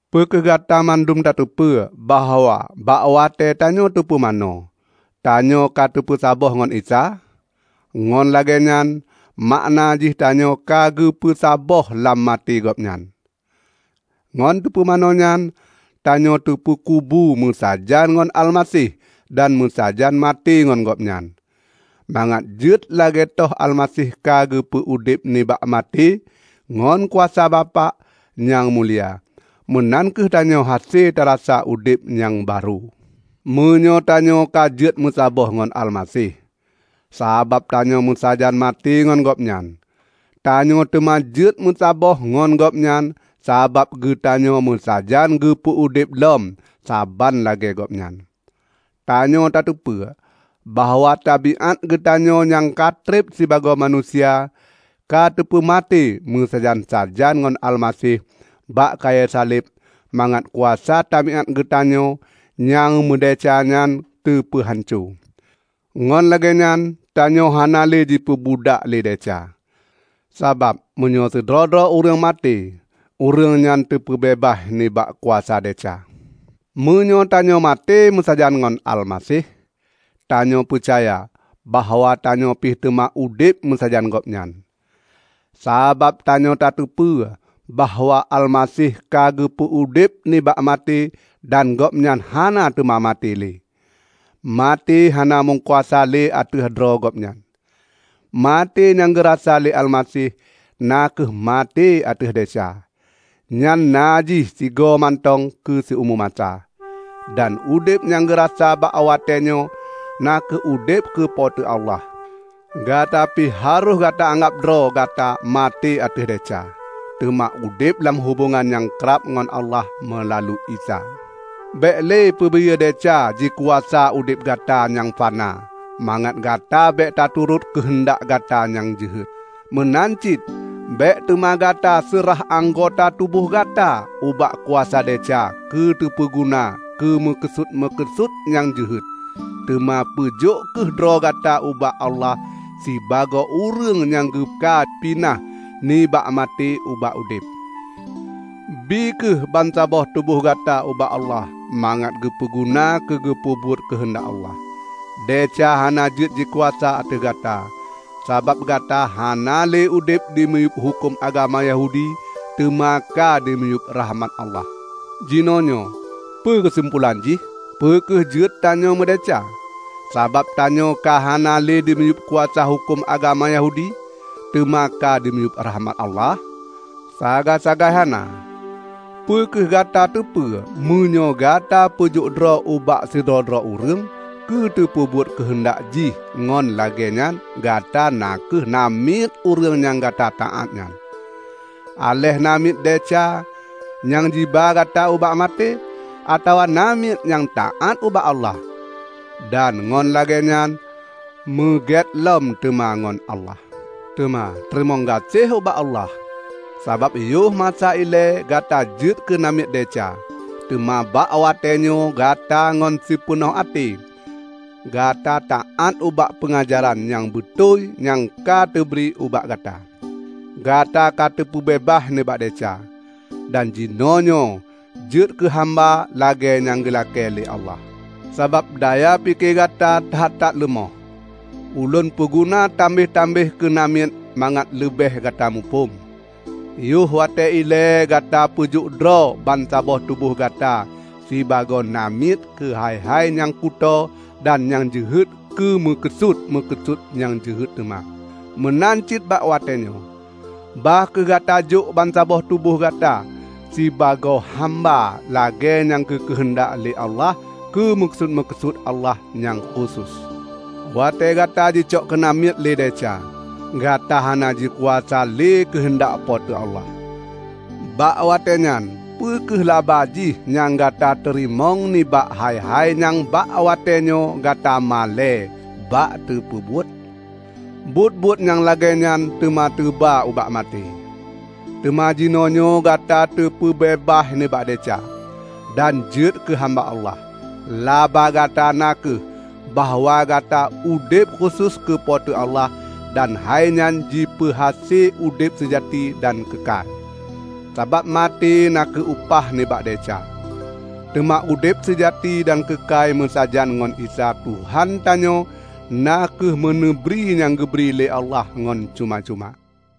Peu kheueh Gata mandum tateupeue bahwa bak watée tanyoe teupumanö, tanyoe ka teupeusaboh ngon Isa? Ngon lagée nyan makna jih tanyoe ka geupeu saboh lam maté Gobnyan. Ngon teupumanö nyan, tanyoe teupeukubu meusajan ngon Almaseh dan meusajan maté ngon Gobnyan, mangat jeuet lagée toh Almaseh ka geupeu udeb nibak maté ngon kuasa Bapak nyang mulia, meunan kheueh tanyoe hase tarasa udeb nyang barô. Meunyoe tanyoe ka jeuet meusaboh ngon Almaseh sabab tanyoe meusajan maté ngon Gobnyan, tanyoe teuma jeuet meusaboh ngon Gobnyan sabab geutanyoe meusajan geupeu udeb lom saban lagée Gobnyan. Tanyoe tateupeue bahwa tabiát geutanyoe nyang katreb sibagoe manusia ka teupeumaté meusajan-sajan ngon Almaseh bak kayée saleb mangat kuasa tabiát geutanyoe nyang meudesya nyan teupeuhanco; ngon lagée nyan tanyoe hana le jipeubudak lé desya. Sabab meunyoe sidroe-droe ureuëng maté, ureuëng nyan teupeubeubaih nibak kuasa desya. Meunyoe tanyoe maté meusajan ngon Almaseh, tanyoe peucaya bahwa tanyoe pih teuma udeb meusajan Gobnyan. Sabab tanyoe tateupeue bahwa Almaseh ka geupeu udeb nibak maté dan Gobnyan hana teuma maté le; maté hana meukuasa le ateueh droe Gobnyan. Maté nyang geurasa lé Almaseh na kheueh maté ateueh desya. Nyan na jih sigoe mantong keu siumu masa. Dan udeb nyang geurasa bak watée nyoe na kheueh udeb keu Po teu Allah. Gata pih harôh gata anggab droe gata maté ateueh desya, teuma udeb lam hubongan nyang krab ngon Allah meulalu Isa. Bék le peubiyeu desya jikuasa udeb gata nyang fana mangat Gata bék taturot keuheundak gata nyang jeuhet. Meunan cit bék teuma Gata seurah anggota tuboh gata ubak kuasa desya keu teupeuguna keu meukeusut-meukeusut nyang jeuhet. Teuma peujok kheueh droe gata ubak Allah sibagoe ureuëng nyang ka geupinah nibak maté ubak udeb. Bie kheueh bansaboh tuboh gata ubak Allah mangat geupeu guna keu geupeubuet keuheundak Allah. Desya hana jeuet jikuasa ateueh gata, sabab gata hana le udeb dimiyueb huköm agama Yahudi teuma ka dimiyueb rakhmat Allah. Jinoenyoe, peue keusimpolan jih? Peu kheueh jeuet tanyoe meudesya, sabab tanyoe ka hana le dimiyueb kuasa huköm agama Yahudi, teuma ka dimiyueb rakhmat Allah? Sagai-sagai hana! Peu kheueh gata teupeu meunyoe gata peujok droe ubak sidroe-droe ureuëng keu teupeubuet keuheundak jih ngon lagée nyan gata na kheueh namiet ureuëng nyang gata taát nyan -- aléh namiet desya nyang jiba gata ubak maté, atawa namiet nyang taát ubak Allah, dan ngon lagée nyan meugét lom teuma ngon Allah. Teuma teurimong gaséh ubak Allah! Sabab yoh masa ilée gata jeuet keu namiet desya, teuma bak watée nyoe gata ngon sipeunoh até gata taát ubak peungajaran nyang beutôi nyang ka teubri ubak gata. Gata ka teupeubeubaih nibak desya, dan jinoenyoe jeuet keu hamba lagée nyang geulakée lé Allah. Sabab daya pike gata that-that leumoh, ulôn peuguna tambeh-tambeh keunamiet mangat leubeh gata muphom. Yoh watée ilée gata peujok droe bansaboh tuboh gata sibagoe namiet keu hai-hai nyang kutoe dan nyang jeuhet keu meukeusut-meukeusut nyang jeuhet teuma. Meunan cit bak watée nyoe, bah kheueh gata jok bansaboh tuboh gata sibagoe hamba lagée nyang geukeuheundak lé Allah keu meukeusut-meukeusut Allah nyang khusos. Watée gata jicok keunamiet lé desya, gata hana jikuasa lé keuheundak Po teu Allah. Bak watée nyan peu kheueh laba jih nyang gata teurimong nibak hai-hai nyang bak watée nyoe gata malée bak tapeubuet? Buet-buet nyang lagée nyan teuma teuba ubak maté! Teuma jinoenyoe gata kateupeubeubaih nibak desya, dan jeuet keu hamba Allah. Laba gata na kheueh bahwa Gata udeb khusos keu Po teu Allah dan hai nyan jipeuhase udeb seujati dan keukai. Sabab maté na kheueh upah nibak desya; teuma udeb seujati dan keukai meusajan ngon Isa Tuhan tanyoe na kheueh meuneubri nyang geubri lé Allah ngon cuma-cuma.